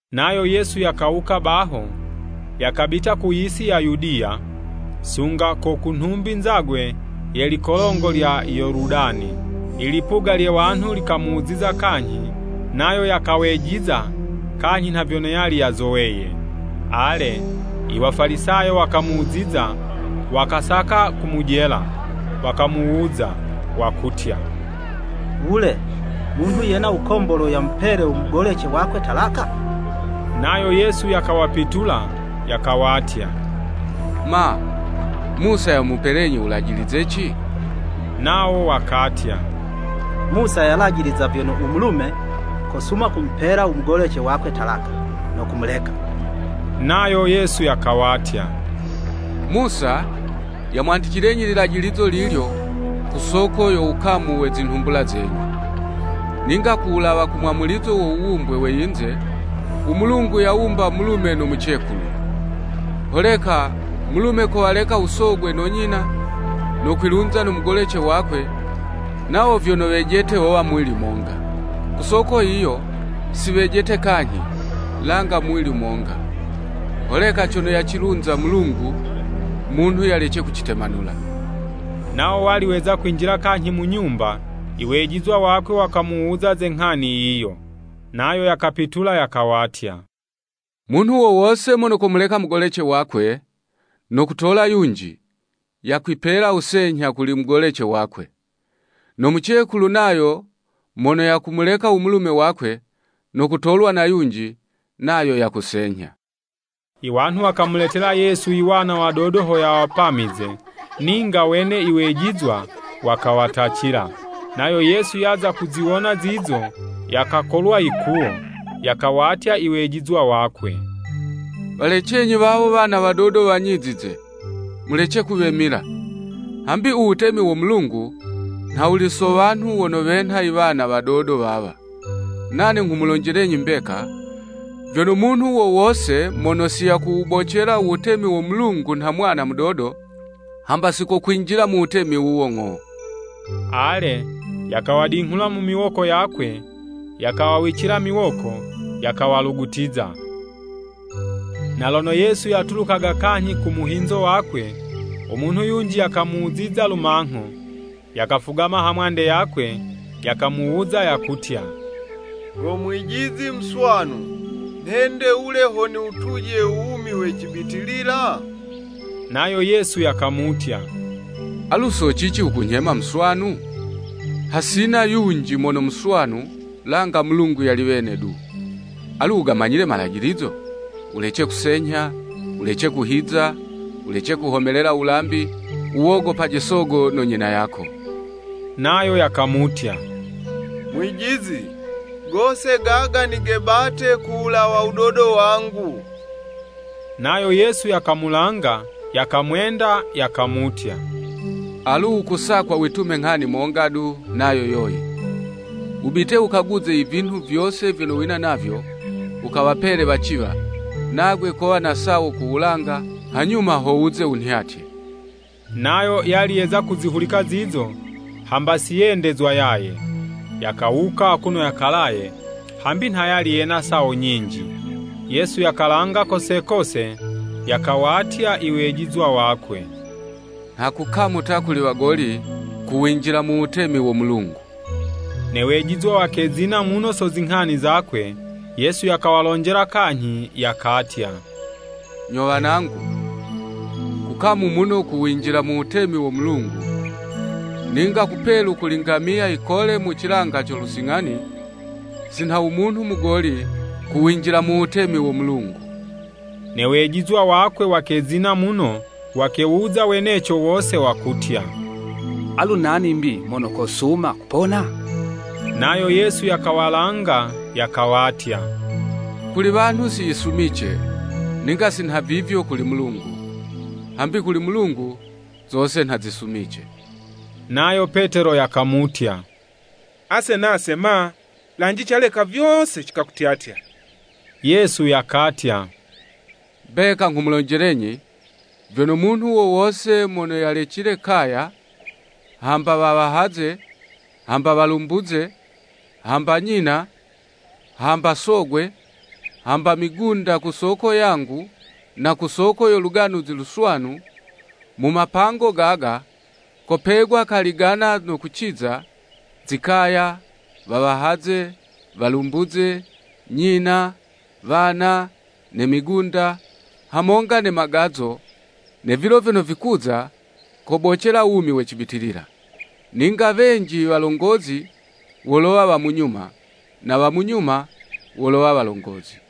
Nayo Yesu yakawuka baho, yakabita ku yisi ya Yudiya, sunga ko ku nhumbi nzagwe ye likolongo lya Yoludani. Ilipuga lye wanhu likamuziza kanyhi, nayo yakawejiza kanyhi nha vyono yali yazoweye. Ale, Iwafalisayo wakamuziza, wakasaka kumujela, wakamuwuza, wakutya, “Wule, munhu yena wukombolwe yamupele u mugolece wakwe talaka.” Nayo Yesu yakawapitula yakawatya, “Ma, Musa yamupelenyi wulajilizeci?” Nawo wakatya, “Musa yalajiliza vyono, u mulume kosuma kumupela umugolece wakwe talaka no kumuleka.” Nayo Yesu yakawatya, “Musa, yamwandicilenyi lilajilizo lilyo, ku soko yo wukamu we zinhumbula zenyu. Ninga ku wulawa ku mwamulizo wo wuwumbwe we yinze, u Mulungu yawumba mulume no mucekulu. Holeka mulume kowaleka u sogwe no nyina, no kwilunza no mugolece wakwe, nawo vyono wejete wowa muwili monga. Ku soko yiyo si wejete kanyhi, langa muwili monga. Holeka cono yacilunza Mulungu, munhu yalece kucitemanula.” Nawo wali weza kwinjila kanyhi mu nyumba, iwejizwa wakwe wakamuwuza ze nghani yiyo. Nayo yakapitula yakawatya, “Munhu wo wose mono komuleka mugolece wakwe, no kutola yunji, yakwipela wusenyha kuli mugolece wakwe. No mucekulu nayo mono yakumuleka u mulume wakwe, no kutolwa na yunji, nayo yakusenyha.” Iwanhu wakamuletela Yesu iwana wadodo ho yawapamize, ninga wene iwejizwa wakawatacila. Nayo Yesu yaza kuziwona zizo, yakakolwa yikuwo, yakawatya iwejizwa wakwe, “Walecenyi wawo iwana wadodo wanyizize, mulece kuwemila, hambi u wutemi wo Mulungu nha wuli so wanhu wono wenha iwana wadodo wawa. Nane nghumulonjelenyi mbeka, vyono, munhu wo wose mono siyakuwubocela u Wutemi wo Mulungu nha mwana mudodo, hamba sikokwinjila mu wutemi wuwo ng'o.” Ale, yakawadinghula mu miwoko yakwe, yakawawicila miwoko, yakawalugutiza. Na lono Yesu yatulukaga kanyhi ku muhinzo wakwe, u munhu yunji yakamuziza lumangho, yakafugama hamwande yakwe, yakamuwuza, yakutya, “Go Mwijizi muswanu, nhende wule ho niwutuje u wumi we cibitilila?” Nayo Yesu yakamutya, “Alu so cici wukunyhema muswanu? Hasina yunji mono muswanu, langa Mulungu yali wene du. Alu wugamanyile imalajilizo? Wulece kusenyha, wulece kuhiza, wulece kuhomelela wulambi, wuwogopaje usogo no nyina yako.” Nayo yakamutya, “Mwijizi, gose gaga nigebate ku wulawa wudodo wangu.” Nayo Yesu yakamulanga, yakamwenda, yakamutya, “Alu wukusakwa witume nghani monga du, nayo yoyi, wubite wukaguze ivinhu vyose vyono wina navyo, wukawapele waciwa, nagwe kowa na sawo ku wulanga, hanyuma ho wuze wunhyatye.” Nayo yali yeza kuzihulika zizo, hamba si yendezwa yaye, yakawuka akuno yakalaye, hambi nha yali yena sawo nyinji. Yesu yakalanga kose kose, yakawatya iwejizwa wakwe, “Nha kukamu ta kuli wagoli, kuwinjila mu Wutemi wo Mulungu.” Ne wejizwa wakezina muno so zinghani zakwe. Yesu yakawalonjela kanyhi, yakatya, “Nyo wanangu, kukamu muno kuwinjila mu Wutemi wo Mulungu! Ninga kupelu kuli ngamiya yikole mu cilanga co lusing'ani, si nha u munhu mugoli kuwinjila mu Wutemi wo Mulungu.” Ne wejizwa wakwe wakezina muno, wakewuza weneco wose, wakutya, “Alu nani 'mbi mono kosuma kupona?” Nayo Yesu yakawalanga, yakawatya, “Kuli wanhu siyisumice, ninga si nhavivyo kuli Mulungu, hambi kuli Mulungu, zose nha zisumice.” Nayo Petelo yakamutya, “Ase nase ma? Lanje, ase caleka vyose cikakutyatya!” Yesu yakatya, “Mbeka nghumulonjelenyi, vyono, munhu wo wose mono yalecile kaya, hamba wawahaze, hamba walumbuze, hamba nyina, hamba sogwe, hamba migunda ku soko yangu na ku soko yo Luganuzi Luswanu, mu mapango gaga, kopegwa kali 'gana no kuciza, zikaya, wawahaze, walumbuze, nyina, wana, ne migunda, hamonga ne magazo, ne vilo vyono vikuza, kobocela wumi we cibitilila. Ninga wenji iwalongozi wolowa wa munyuma, na wa munyuma, wolowa walongozi.”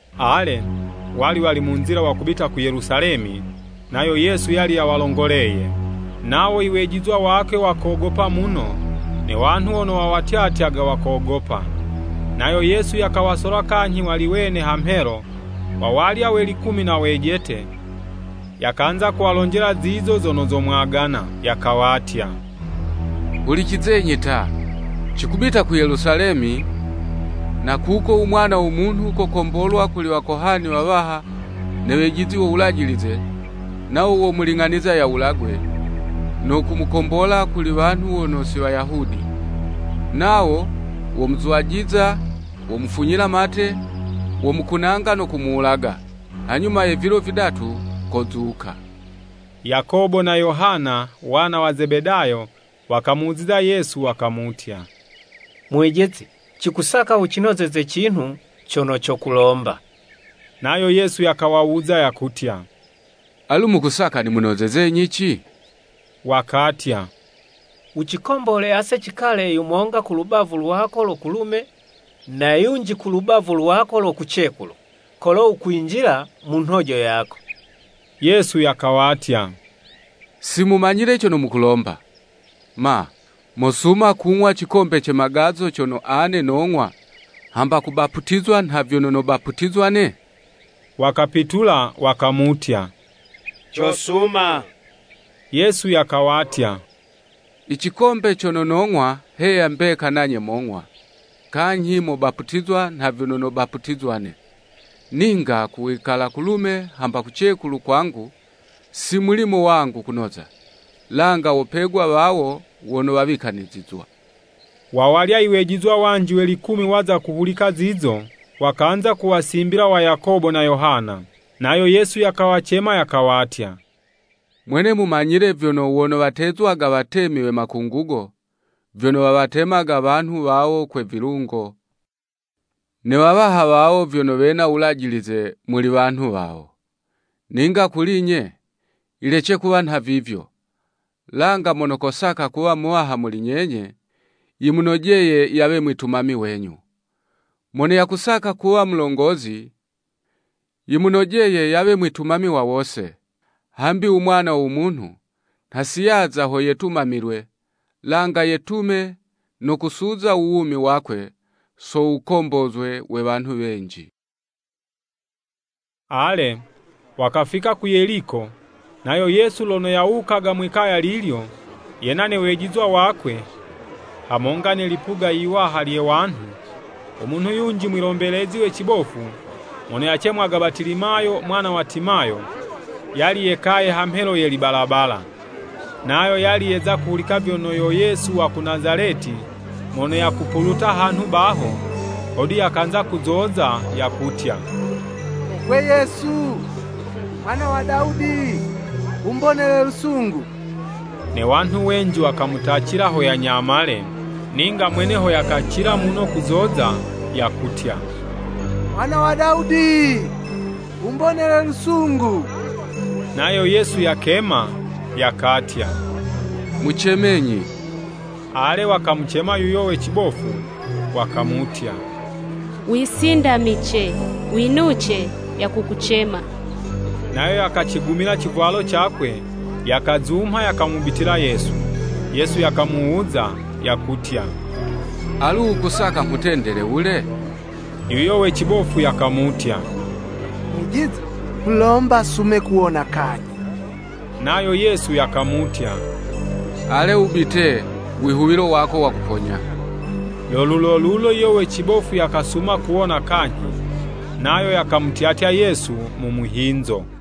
Ale, wali wali mu nzila wakubita ku Yelusalemi, nayo yali yawalongoleye. Nawo iwejizwa wakwe wakogopa muno, ne wanhu wono wawatyatyaga wakogopa. Nayo Yesu yakawasola kanyhi wali wene hamhelo, wawalya we likumi na wejete, yakanza kuwalonjela zizo zono zomwagana, “Yakawatya, Hulicizenyi ta! Cikubita ku Yelusalemi, na kuko u Mwana wo Munhu, kokombolwa kuli wakohani wawaha ne wejizi wo Wulajilize, nawo womuling'aniza yawulagwe, no kumukombola kuli wanhu wono si Wayahudi. Nawo womuzwajiza, womufunyila mate, womukunanga no kumuwulaga. Hanyuma ye vilo vidatu kozuka.” Yakobo na Yohana, wana wa Zebedayo, wakamuziza Yesu wakamutya, “Mwijizi cikusaka wucinozeze cinhu cono cokulomba.” Nayo Yesu yakawawuza, yakutya, “Alu mukusaka nimunozezenyi ci?” Wakatya, “Wucikombole ase cikale yumonga ku lubavu lwako lo kulume na yunji ku lubavu lwako lo kucekulu, kolo wukwinjila mu nhojo yako.” Yesu yakawatya, “Simumanyile cono mukulomba! Ma, mosuma kung'wa cikombe ce Magazo cono ane nong'wa, hamba kubaputizwa nha vyono nobaputizwa 'ne?” Wakapitula, wakamutya, “Cosuma.” Yesu yakawatya, “I Cikombe cono nog'wa heya mbeka nanye mong'wa, kanyhi mobaputizwa nha vyono nobaputizwa'ne. Ninga ku wikala kulume hamba kucekulu kwangu, si mulimo wangu kunoza, langa wopegwa wawo wono wawikanizizwa.” Wawalya iwejizwa wanji we likumi waza kuzihulika zizo, wakanza kuwasimbila wa Yakobo na Yohana. Nayo Yesu yakawacema yakawatya, “Mwene mumanyile vyono wono watezwaga watemi we Makungugo, vyono wawatemaga wanhu wawo kwe vilungo, ne wawaha wawo vyono wena wulajilize muli wanhu wawo. Ninga kuli'nye, yilece kuwa nhavivyo, langa mono kosaka kuwa muwaha muli nyenye, yimunojeye yawe mwitumami wenyu. Mono yakusaka kuwa mulongozi, yimunojeye yawe mwitumami wa wose. Hambi u Mwana wo Munhu nha si yaza ho yetumamilwe, langa yetume no kusuza u wumi wakwe so wukombozwe we wanhu wenji.” Ale, wakafika ku Yeliko, nayo Yesu lono yawukaga mwi'kaya lilyo, yena ne wejizwa wakwe, hamonga ne lipuga yiwaha lye wanhu, u munhu yunji mwilombelezi we cibofu, mono yacemwaga Batilimayo mwana wa Timayo, yali yekaye ha mhelo ye libalabala. Nayo yali yeza kuhulika vyono yo Yesu wa ku Nazaleti mono yakupuluta hanhu baho, hodu yakanza kuzoza, yakutya, “Gwe Yesu, Mwana wa Dawudi Wumbonele lusungu!” Ne wanhu wenji wakamutacila ho yanyamale, ninga mwene ho yakacila muno kuzoza, yakutya, “Mwana wa Dawudi, Wumbonele lusungu.” Nayo Yesu yakema, yakatya, “Mucemenyi.” Ale, wakamucema yuyo we cibofu, wakamutya, “Wisindamice! Winuce, yakukucema.” Nayo yakacigumila icivwalo cakwe, yakazumha, yakamubitila Yesu. Yesu yakamuwuza, yakutya, “Alu wukusaka nghutendele wule?” Yuyo we cibofu yakamutya, “Mwijizi, nghulomba sume kuwona kanyhi.” Nayo Yesu yakamutya, “Ale wubite, wihuwilo wako wakuponya.” Lo lulolulo yuyo we cibofu yakasuma kuwona kanyhi, nayo yakamutyatya Yesu mu muhinzo.